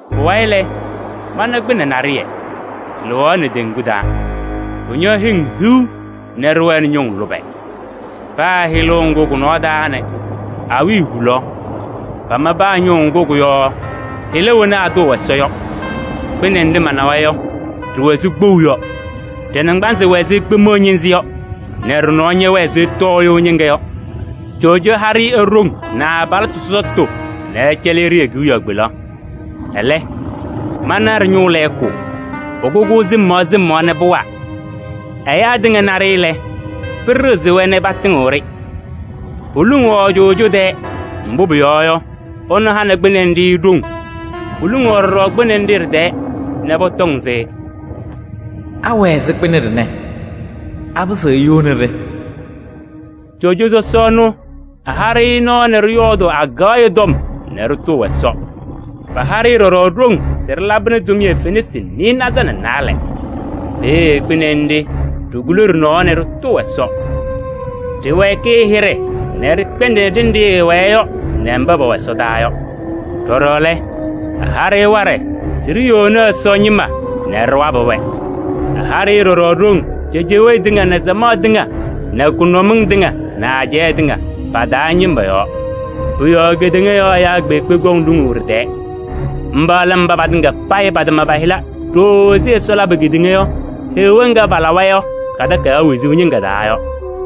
Pʋwayɩ lɛ, mana kpɩnɛ naɖɩyɛ, ɖɩlɩɣaɣnɩ teŋgu taa. Ɖɩñɔ hɩŋ hiu nɛ ɖɩwɛnɩ ñʋŋ lʋbɛ. Paa hɩlʋʋ ŋgʋ kʋ-nɔɔ taa nɛ awiya hulaɣ, pama paa ñʋʋ ŋgʋ kʋ-yɔɔ hɩla wena atʋʋ Ɛsɔ yɔ. Kpɩnɛ nɖɩ manawa yɔ, ɖɩwɛ ɛzɩ kpou yɔ. Ɖɩ-naŋgbanzɩ wɛ ɛzɩ kpemiɣa ñɩnzɩ yɔ nɛ ɖɩ-nɔɔ ñɛwɛɛ ɛzɩ tɔɔyʋʋ ñɩŋga yɔ. Coojo ha-ɖɩ e-ɖoŋ nɛ ɛ-abalɩtʋ sɔsɔtʋ nɛ ɛcɛlɩ-ɖɩ e-kewiyaɣ kpelaɣ. Ɛlɛ, mana ɖɩ-ñʋʋ lɛɛkʋ, pʋkʋ-kʋ sɩm yɔɔ sɩm yɔɔ nɛ pʋwaa. Ɛyaa tɩŋa na-ɖɩ lɛ, pɩɖɩɣzɩ-wɛ nɛ patɩŋɩɣ-ɖɩ. Poluŋaɣ coojo tɛɛ, mbʋ pʋyɔɔ yɔ, ɛnʋ hanɩ kpɩnɛ nɖɩ ɖoŋ. Poluŋaɣ ɖɔɖɔ kpɩnɛ nɖɩ ɖɩ-tɛɛ nɛ pɔtɔŋ se: “Anɩɣzɩnɩ kpɩnɛ ɖɩnɛ? Apɩzɩɣ eyoni-ɖɩ?” Coojo sɔsɔ ɛnʋ, ɛha-ɖɩ nɔɔ nɛ ɖɩyɔɔdʋʋ akaɣya tɔm nɛ ɖɩtʋʋ Ɛsɔ. Paha-ɖɩ ɖɔɖɔ ɖoŋ se ɖɩlabɩnɩ tʋmɩyɛ fenasɩ nɩɩnaza nɛ naalɛ. Peeye kpɩnɛ nɖɩ ɖikuli ɖɩ-nɔɔ nɛ ɖɩtʋʋ Ɛsɔ. Ɖɩwɛɛkɩ ɛ-hɩɖɛ nɛ ɖɩkpɛndɩnɩ ɖenɖe ɛwɛɛ yɔ nɛ mba pɛwɛ ɛsɔdaa yɔ. Ɖɔɖɔ lɛ, ɛha-ɖɩ waɖɛ se ɖiyoni Ɛsɔ ñɩma nɛ ɖɩwabɩ-wɛ. Ɛha-ɩ ɖɔɖɔ ɖoŋ cejewee tɩŋa nɛ samaɣ tɩŋa nɛ kʋnʋmɩŋ tɩŋa nɛ ajɛɛ tɩŋa pa-taa ñɩma yɔɔ. Pʋ-yɔɔ kedeŋa yɔɔ ɛyaa kpeekpe kɔŋ luŋuu ɖɩ-tɛɛ. Mba lɛ mba patɩŋa payɩ patama pa-hɩla wezuu takayaɣ taa ɖooo ɛzɩ Ɛsɔ labʋ kedeŋa yɔ. Takayaɣ ŋga lɛ Heɣa ŋga palawa yɔ ka-ñɩŋga.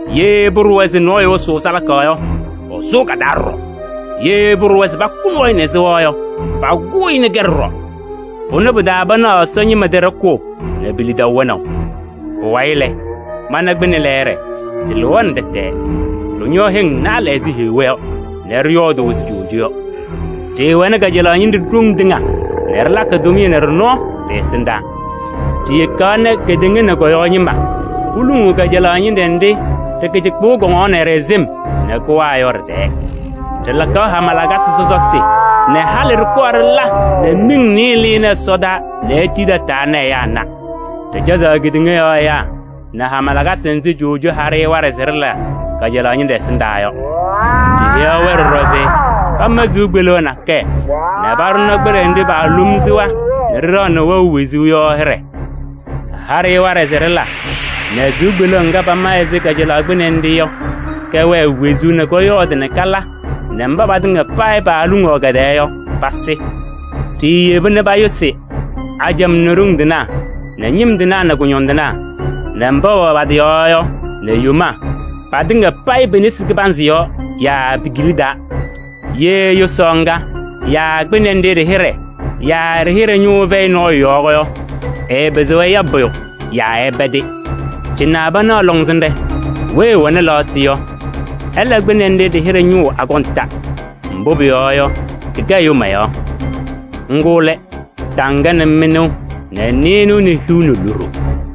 Ye pʋɖʋwa se nɔɔyʋ ɛsʋʋ salaka yɔ, ɛsʋʋ ka-taa ɖɔɖɔ. Ye pʋɖʋwa se pakʋ nɔɔyʋ nɛ sɩɣa yɔ, pakʋʋ-ɩ nɛ kɛ ɖɔɖɔ. Pʋnɛ pɩ-taa panaɣ Ɛsɔ ñɩma tɩ ɖɔkʋʋ nɛ pe-lidaʋ wɛnaʋ. Pʋwayɩ lɛ, mana kpɩnɛ lɛɛɖɛ, ɖɩlɩɣaɣnɩ tɛtɛɛ. Ɖɩñɔ hɩŋ naalɛ ɛzɩ heɣa yɔ nɛ ɖɩyɔɔdʋʋ ɛzɩ coojo yɔ. Ɖɩɩwɛnɩ kajalaɣ ñɩnɖɛ ɖoŋ tɩŋa nɛ ɖɩlakɩ tʋmɩyɛ nɛ ɖɩ-nɔɔ ɖɩ-ɛsɩndaa. Ɖiyekaɣ nɛ kedeŋa nɛ kɔ-yɔɔ ñɩma poluŋuu kajalaɣ ñɩnɖɛ nɖɩ ɖɩ-kɩcɩkpʋʋ kɔŋaɣnɩ-ɖɩ sɩm nɛ kʋwaa yɔ ɖɩ-tɛɛ. Ɖɩlakaɣ hama lakasɩ sɔsɔsɩ nɛ halɩ ɖɩkɔɔ ɖɩla nɛ miŋ nɩɩyɩ lɩnɩ ɛsɔdaa nɛ etii tataa nɛ ɛyaa na. Ɖɩcɛzaɣ kedeŋa yɔɔ ɛyaa nɛ hama lakasɩ nzɩ coojo ha-ɖɩ waɖɛ se ɖɩla kajalaɣ ñɩnɖɛ ɛsɩndaa yɔ. Ɖiheyaɣ-wɛ ɖɔɖɔ se pama sɩʋ kpeleɣ nakɛyɛ nɛ paɖʋnɩ kpɩnɛ nɖɩ paalom sɩɣa nɛ ɖɩɖaɣnɩ wɛʋ wezuu yɔ hɩɖɛ. Ɛha-ɖɩ waɖɛ se ɖɩla nɛ sɩʋ kpeleɣ ŋga pama ɛzɩ kajalaɣ kpɩnɛ nɖɩ yɔ, kɛwɛɛ wezuu nɛ kɔyɔɔdɩ nɛ kala nɛ mba patɩŋa payɩ paaluŋuu kɛ-tɛɛ yɔ, pasɩ. Ɖiiyeba nɛ payʋsɩ ajamaa nɛ ɖoŋ tɩnaa nɛ ñɩm tɩnaa nɛ kʋñɔndɩnaa nɛ mba pɛwɛ pa-tɩ yɔɔ yɔ nɛ yomaa patɩŋa payɩ pe-nesi kɩbanzɩ yɔɔ yaa pe-kila taa. Ye yʋsaɣ ŋga yaa kpɩnɛ nɖɩ ɖɩ-hɩɖɛ yaa ɖɩ-hɩɖɛ ñʋʋ ɛfɛyɩ nɔɔyʋ yɔɔ yɔ, ɛɛpɩzɩɣ ɛya pʋyʋ yaa ɛpɛdɩ. Cɩnɛ panaɣ lɔŋsɩnɖɛ: weyi ɛwɛnɩ lɛɣtʋ yɔ, ɛla kpɩnɛ nɖɩ ɖɩ-hɩɖɛ ñʋʋ akɔnta. Mbʋ pʋyɔɔ yɔ, kɩkɛ ɛyʋ mayaɣ. Ŋgʋ lɛ taŋga nɛ mɩnʋʋ nɛ nɩɩnʋwa nɛ hiu nɛ loɖo.